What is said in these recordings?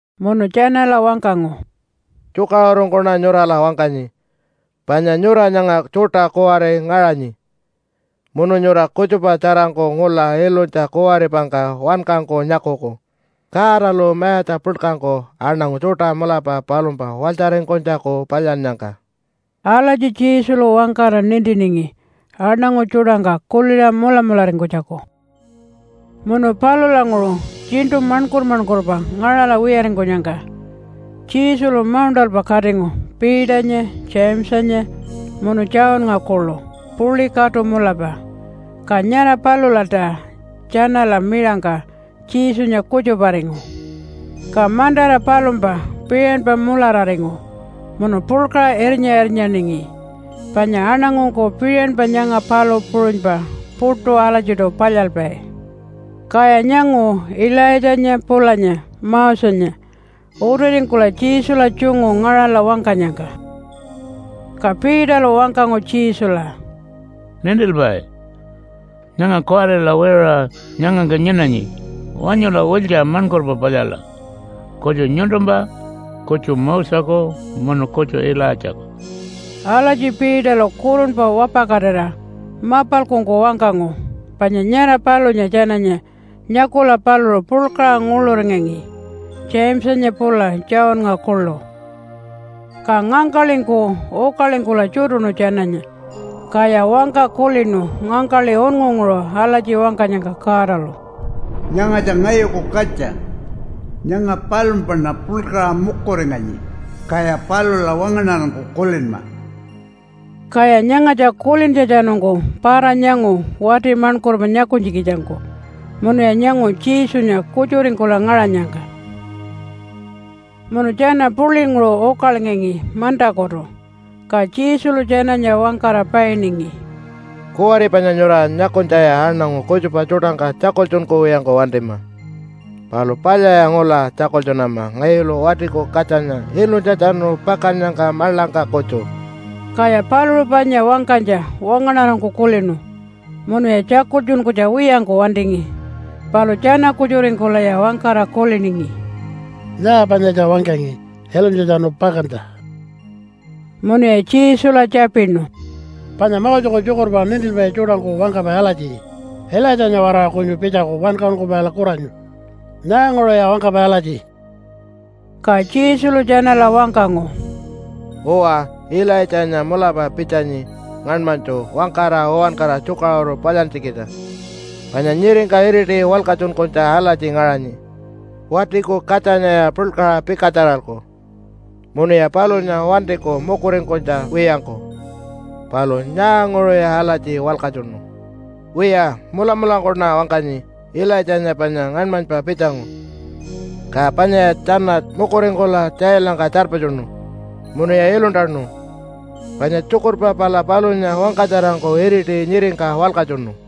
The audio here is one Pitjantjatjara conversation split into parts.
Munu tjanala wangkangu, “Tjukaṟurungkuṉa nyurala wangkanyi, panya nyura nyanga tjuṯa kuwari ngaṟanyi, munu nyura kutjupa tjarangku ngula ilunytja kuwaripangka wankangku nyakuku Godalu mayatja puḻkangku aṉangu tjuṯa mulapa palumpa walytjaringkunytjaku palyannyangka.” Alatji Jesulu wangkara nintiningi aṉangu tjuṯangka kuliṟa mulamularingkunytjaku. Munu palulanguṟu tjiṉṯu maṉkur-maṉkurpa ngaṟala wiyaringkunyangka Jesulu mauṉṯalpa katingu Peternya, Jamesanya munu Johnnga kuḻu puḻi katu mulapa. Ka nyara palulalta tjanala miṟangka Jesunya kutjuparingu. Ka mantara palumpa piṟanpa mulararingu munu puḻkaṟa irnya-irnyaningi, panya aṉangungku piṟanpa nyanga palu puṟunypa puṯu alatjiṯu palyalpai. Kaya nyangu Ilaitjanya pulanya Mosenya utiringkula Jesula tjungu ngaṟala wangkanyangka. Ka Peterlu wangkangu Jesula, “Nintilpai, nyanga kuwarila wiṟuṟa nyangangka nyinanyi. Wanyula wiltja maṉkurpa palyala, kutju nyuntumpa, kutju Moseku, munu kutju Ilaitjaku!” (Alatji Peterlu kurunpa wapakatira mapalkungku wangkangu, panya nyara palunya tjananya nyakula paluṟu puḻkaṟa nguḻuringangi, Jamesanya pula Johnnga kuḻu.) Ka ngangkaḻingku ukalingkula tjutuṉu tjananya, kaya wangka kulinu ngangkaḻi unngunguṟu alatji wangkanyangka Godalu, “Nyangatja ngayuku katja. Nyanga palumpaṉa puḻkaṟa mukuringanyi, kaya palula wangaṉarangku kulinma!” Kaya nyangatja kulintjatjanungku para-nyangu wati maṉkurpa nyakunytjikitjangku munuya nyangu Jesunya kutjuringkula ngaṟanyangka. Munu tjana puḻinguṟu ukalingangi mantakutu, ka Jesulu tjanala wangkara painingi, “Kuwari panya nyura nyakunytjaya aṉangu kutjupa tjuṯangka tjakultjunkuwiyangku wantima. Palu palyaya ngula tjakultjunama ngayulu Watiku Katjanya ilunytjatjanu pakannyangka maḻangka kutju.” Kaya paluṟu panya wangkanytja wangaṉarangku kulinu munuya tjakultjunkunytja wiyangku wantingi, palu tjana-kutjuringkulaya wangkara kuliningi, “Nyaa panyatja wangkangi ilunytjatjanu pakantja?” Munuya Jesula tjapinu, “Panya Moseku tjukurpa nintilpai tjuṯangku wangkapai alatji, ‘Ilaitjanya-waraṟa kunyu pitjaku Wankaṟunkupaila kuranyu?’ Nyaanguṟuya wangkapai alatji?” Ka Jesulu tjanala wangkangu, “Uwa, Ilaitjanya mulapa pitjanyi ngaṉmanytju wangkara uwankara tjukaṟuru palyantjikitja. Panya nyiringka iriti walkatjunkunytja alatji ngaṟanyi, ‘Watiku Katjanyaya puḻkaṟa pikatjaralku munuya palunya wantiku mukuringkunytja wiyangku.’ Palu nyaanguṟuya alatji walkatjunu? Wiya, mulamulangkuṉa wangkanyi Ilaitjanya panya ngaṉmanypa pitjangu, ka panyaya tjana mukuringkula tjailangka tjarpatjunu munuya iluntanu, panya tjukurpa pala palunya wangkatjarangku iriti nyiringka walkatjunu.”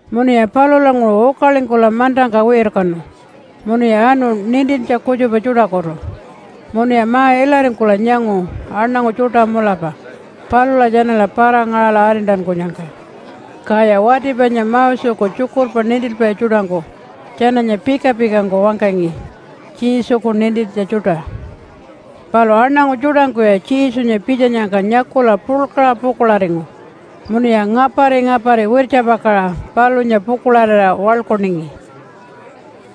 Munuya palulanguṟu ukalingkula mantangka wirkanu munuya anu nintintja kutjupa tjuṯakutu. Munuya ma-ilaringkula nyangu aṉangu tjuṯa mulapa palula tjanala para-ngaṟala arintankunyangka. Kaya wati panya Moseku tjukurpa nintilpai tjuṯangku tjananya pika-pikangku wangkangi Jesuku nintintja tjuṯa. Palu aṉangu tjuṯangkuya Jesunya pitjanyangka nyakula puḻkaṟa pukuḻaringu munuya ngapari-ngapari wirtjapakaṟa palunya pukuḻarira waḻkuningi.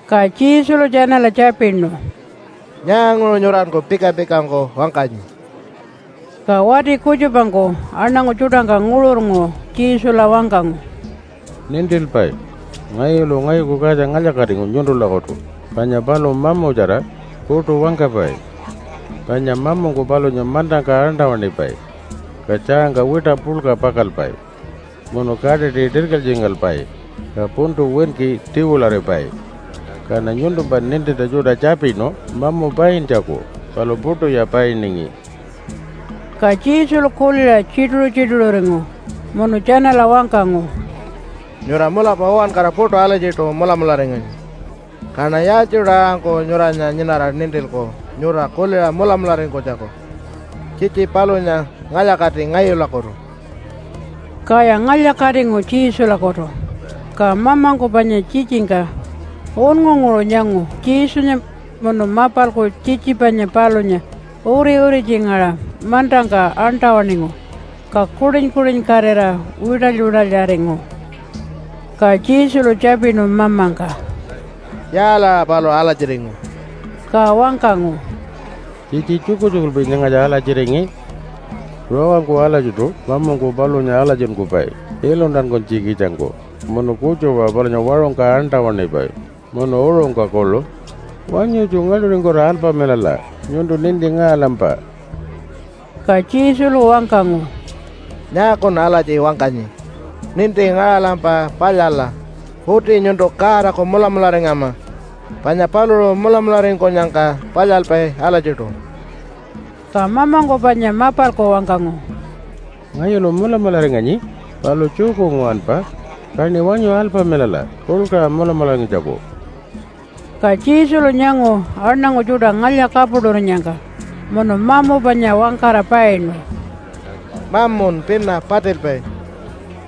Ka Jesulu tjanala tjapinu, “Nyaanguṟu nyuranku pika-pikangku wangkanyi?” Ka wati kutjupangku aṉangu tjuṯangka nguṟurnguṟu Jesula wangkangu, “Nintilpai, ngayulu ngayuku katja ngalya-katingu nyuntulakutu panya paluṟu mamutjara, puṯu wangkapai. Panya mamungku palunya mantangka aṉṯa-waṉipai, ka tjaangka wiṯa puḻka pakalpai, munu kaṯiṯi tirkilytjingalpai ka puntu winki tiwilaripai. Kaṉa nyuntumpa nintintja tjuṯa tjapinu mamu paintjaku, palu puṯuya painingi.” Ka Jesulu kuliṟa tjituṟu-tjituṟuringu munu tjanala wangkangu, “Nyura mulapa uwankara puṯu alatjiṯu mulamularinganyi. Kaṉa yaaltjiṯu aṟangku nyuranya nyinara nintilku nyura kuliṟa mulamularingkunytjaku? Tjitji palunya ngalya-kati ngayulakutu!” Kaya ngalya-katingu Jesulakutu. Ka mamungku panya tjitjingka unngunguṟu nyangu Jesunya munu mapalku tjitji panya palunya uri-uritjingaṟa mantangka aṉṯa-waṉingu ka kuṯin-kuṯinkatira wiṯaly-wiṯalyaringu. Ka Jesulu tjapinu mamangka, “Yaalaṟa paluṟu alatjiringu?” Ka wangkangu, “Tjitji tjukutjukulpi nyangatja alatjiringi. Rawangku alatjiṯu mamungku palunya alatjinkupai iluntankunytjikitjangku, munu kutjupa-aṟa palunya waṟungka aṉṯa-waṉipai munu uṟungka kuḻu. Wanyutju ngaḻṯuringkula alpamilala, nyuntu ninti ngaṟalampa.” Ka Jesulu wangkangu, “Nyaakun alatji wangkanyi, ‘Ninti ngaṟalampa palyala?’ Uti nyuntu Godaku mulamularingama, panya paluṟu mulamularingkunyangka palyalpai alatjiṯu.” Ka mamangku panya mapalku wangkangu, “Ngayulu mulamularinganyi, palu tjuku nguwanpa, kaṉi wanyu alpamilala puḻkaṟa mulamularingkunytjaku.” Ka Jesulu nyangu aṉangu tjuṯa ngalya-kapuṯurinyangka munu mamu panya wangkara painu, “Mamun pina patilpai,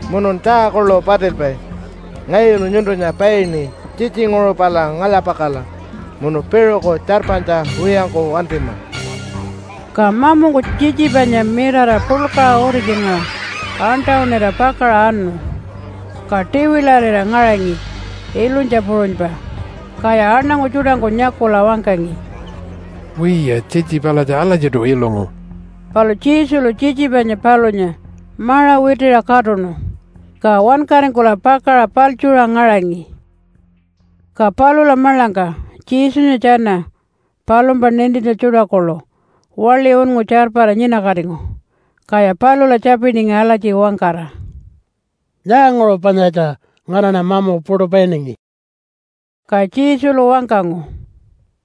munun tjaa kuḻu patilpai. Ngayulu nyuntunya paini, tjitjinguṟu pala ngalya-pakala munu piṟuku tjarpanytja wiyangku wantima.” Ka mamungku tjitji panya mirara puḻkaṟa uritjingaṟa aṉṯa-waṉira pakaṟa anu, ka tiwilarira ngaringi ilunytja puṟunypa. Kaya aṉangu tjuṯangku nyakula wangkangi, “Wiya, tjitji palatja alatjiṯu ilungu.” Palu Jesulu tjitji panya palunya maṟa witiṟa katuṉu, ka wankaringkula pakaṟa paḻtjuṟa ngaṟangi. Ka palula maḻangka Jesunya tjana palumpa nintintja tjuṯa kuḻu waḻi unngu tjarpara nyinakatingu. Kaya palula tjapiningi alatji wangkara, “Nyaanguṟu panyatja nganaṉa mamu puṯu painingi?” Ka Jesulu wangkangu,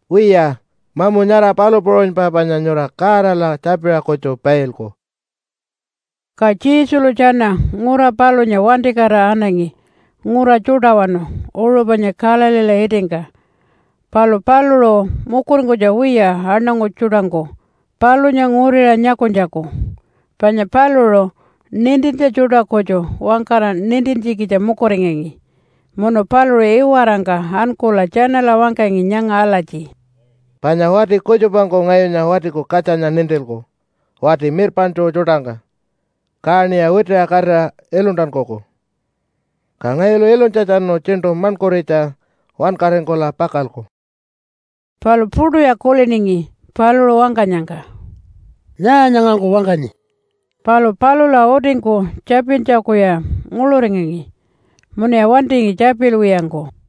“Wiya, mamu nyara palu puṟunypa panya nyura Godala tjapiṟa kutju pailku.” Ka Jesulu tjana ngura palunya wantikatira anangi ngura tjuṯawanu uṟu panya Galileela itingka. Palu paluṟu mukuringkunytja wiya aṉangu tjuṯangku palunya nguriṟa nyakunytjaku, panya paluṟu nintintja tjuṯa kutju wangkara nintintjikitja mukuringangi. Munu paluṟu iwarangka ankula tjanala wangkangi nyanga alatji, “Panya wati kutjupangku ngayunya Watiku Katjanya nintilku wati mirpaṉtju tjuṯangka, kaṉiya witiṟa katira iluntankuku. Ka ngayulu ilunytjatjanu tjiṉṯu maṉkuritja wankaringkula pakalku.” Palu puṯuya kuliningi paluṟu wangkanyangka, “Nyaa nyangangku wangkanyi?” Palu palula utingku tjapintjakuya nguḻuringangi munuya wantingi tjapilwiyangku.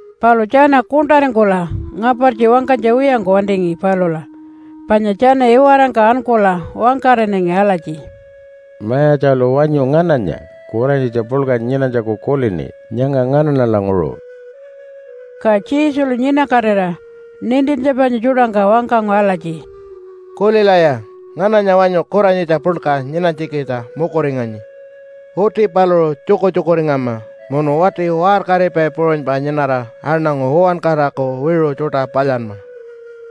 Palu tjana kuṉṯaringkula ngapartji wangkanytja wiyangku wantingi palula, panya tjana iwarangka ankula wangkaṟinangi alatji, “Mayatjalu wanyu ngananya kuranyitja puḻka nyinanytjaku kulini nyanga nganaṉalanguṟu?” Ka Jesulu nyinakatira nintintja panya tjuṯangka wangkangu alatji, “Kulilaya. Ngananya wanyu kuranyitja puḻka nyinanytjikitja mukuringanyi? Uti paluṟu tjukutjukuringama munu wati waṟkaripai puṟunypa nyinara aṉangu uwankaraku wiṟu tjuṯa palyanma.”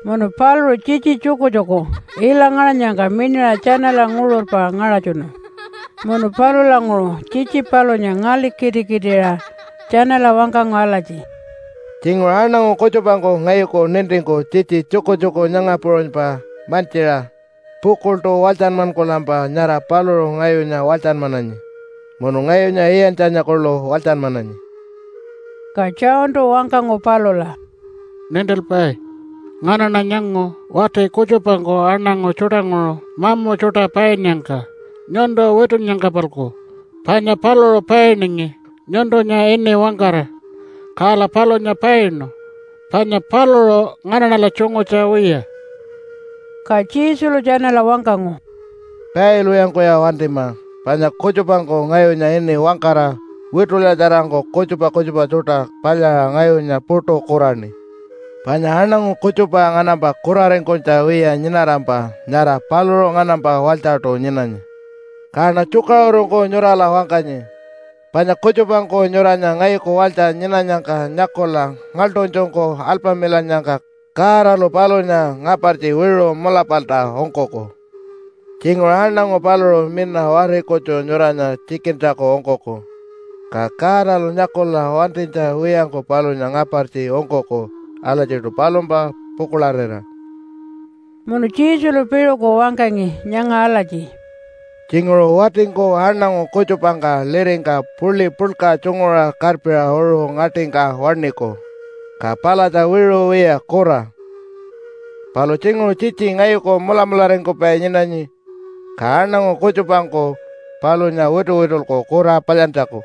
Munu paluṟu tjitji tjukutjuku ila ngaṟanyangka miṉaṟa tjanala nguṟurpa ngaṟatjunu munu palulanguṟu tjitji palunya ngaḻikitikitiṟa tjanala wangkangu alatji, “Tjinguṟu aṉangu kutjupangku ngayuku nintingku tjitji tjukutjuku nyanga puṟunypa mantjiṟa pukuḻṯu walytjanmankulampa, nyara paluṟu ngayunya walytjanmananyi munu ngayunya iyantjanya kuḻu walytjanmananyi.” Ka Johntu wangkangu palula, “Nintilpai, nganaṉa nyangu wati kutjupangku aṉangu tjuṯanguṟu mamu tjuṯa painnyangka nyuntu witunnyangka-palku, panya paluṟu painingi nyuntunya ini wangkara. Kala palunya painu, panya paluṟu nganaṉala tjungutja wiya.” Ka Jesulu tjanala wangkangu, “Pailwiyangkuya wantima, panya kutjupangku ngayunya ini wangkara witulyatjarangku kutjupa kutjupa tjuṯa palyaṟa ngayunya puṯu kuraṉi. Panya aṉangu kutjupa nganampa kuraringkunytja wiya nyinarampa nyara paluṟu nganampa walytjaṯu nyinanyi. Kaṉa tjukaṟurungku nyurala wangkanyi, panya kutjupangku nyuranya ngayuku walytja nyinanyangka nyakula ngaḻṯunytjungku alpamilannyangka, Godalu palunya ngapartji wiṟu mulapalta ungkuku. Tjinguṟu aṉangu paluṟu mina wari kutju nyuranya tjikintjaku ungkuku, ka Godalu nyakula wantinytja wiyangku palunya ngapartji ungkuku alatjiṯu palumpa pukuḻarira.” Munu Jesulu piṟuku wangkangi nyanga alatji, “Tjinguṟu watingku aṉangu kutjupangka liringka puḻi puḻka tjunguṟa karpiṟa uṟu ngaṯingka waṉiku, ka palatja wiṟu wiya kura. Palu tjinguṟu tjitji ngayuku mulamularingkupai nyinanyi, ka aṉangu kutjupangku palunya wituwitulku kura palyantjaku,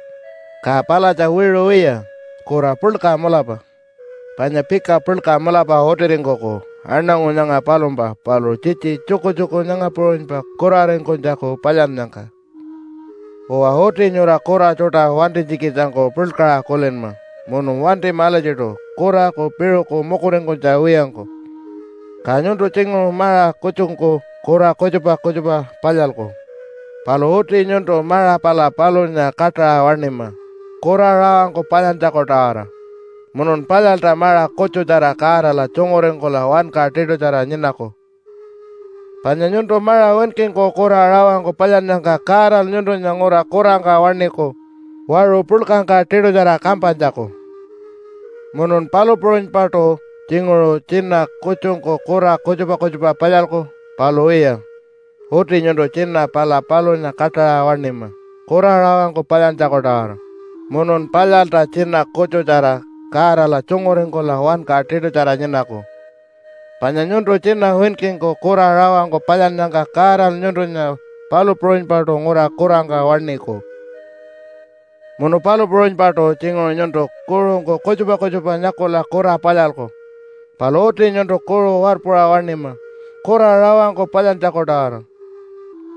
ka palatja wiṟu wiya kura puḻka mulapa. Panya pika puḻka mulapa utiringkuku aṉangu nyanga palumpa paluṟu tjitji tjukutjuku nyanga puṟunypa kuraringkunytjaku palyannyangka. “Uwa, uti nyura kura tjuṯa wantinytjikitjangku puḻkaṟa kulinma munu wantima alatjiṯu kuraku piṟuku mukuringkunytja wiyangku. Ka nyuntu tjinguṟu maṟa kutjungku kura kutjupa kutjupa palyalku. Palu uti nyuntu maṟa pala palunya kaṯaṟa waṉima kura rawangku palyantjaku-tawara, munun palyalta maṟa kutjutjara Godala tjunguringkula wanka tiṯutjara nyinaku, panya nyuntu maṟa winkingku kura rawangku palyannyangka Godalu nyuntunya ngura kurangka waṉiku waṟu puḻkangka tiṯutjara kampanytjaku. “Munun palu puṟunypaṯu tjinguṟu tjina kutjungku kura kutjupa kutjupa palyalku. Palu wiya, uti nyuntu tjina pala palunya kaṯaṟa waṉima kura rawangku palyantjaku-tawara, munun palyalta tjina kutjutjara Godala tjunguringkula wanka tiṯutjara nyinaku, panya nyuntu tjina winkingku kura rawangku palyannyangka Godalu nyuntunya palu puṟunypaṯu ngura kurangka waṉiku. “Munu palu puṟunypaṯu tjinguṟu nyuntu kuṟungku kutjupa kutjupa nyakula kura palyalku. Palu uti nyuntu kuṟu warpuṟa waṉima kura rawangku palyantjaku-tawara,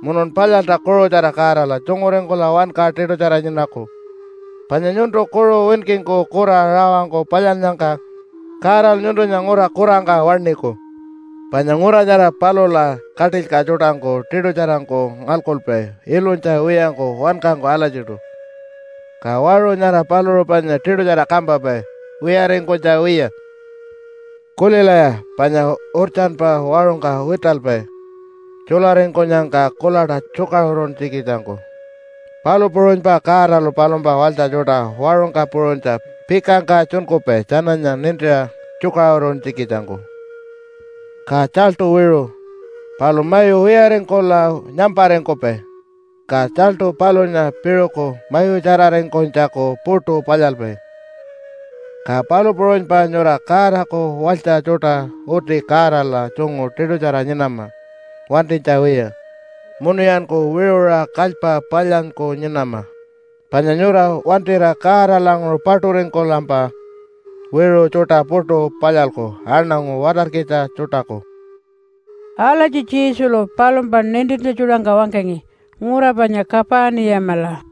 munun palyalta kuṟutjara Godala tjunguringkula wanka tiṯutjara nyinaku, panya nyuntu kuṟu winkingku kura rawangku palyannyangka Godalu nyuntunya ngura kurangka waṉiku. Panya ngura nyara palula katilyka tjuṯangku tiṯutjarangku ngalkupai ilunytja wiyangku wankangku alatjiṯu, ka waṟu nyara paluṟu panya tiṯutjara kampapai wiyaringkunytja wiya. “Kulilaya, panya urtjanpa waṟungka witalpai tjularingkunyangka kuḻaṯa tjukaṟuruntjikitjangku. Palu puṟunypa Godalu palumpa walytja tjuṯa waṟungka puṟunytja pikangka tjunkupai tjananya nintiṟa tjukaṟuruntjikitjangku. “Ka tjaltu wiṟu, palu mayu wiyaringkula nyamparingkupai ka tjaltu palunya piṟuku mayutjararingkunytjaku puṯu palyalpai. Ka palu puṟunypa nyura Godaku walytja tjuṯa uti Godala tjungu tiṯutjara nyinama wantinytja wiya, munuyanku wiṟuṟa kalypa palyanyku nyinama, panya nyura wantira Godalanguṟu paṯuringkulampa wiṟu tjuṯa puṯu palyalku aṉangu watarkitja tjuṯaku.” Alatji Jesulu palumpa nintintja tjuṯangka wangkangi ngura panya Kapaniyamala.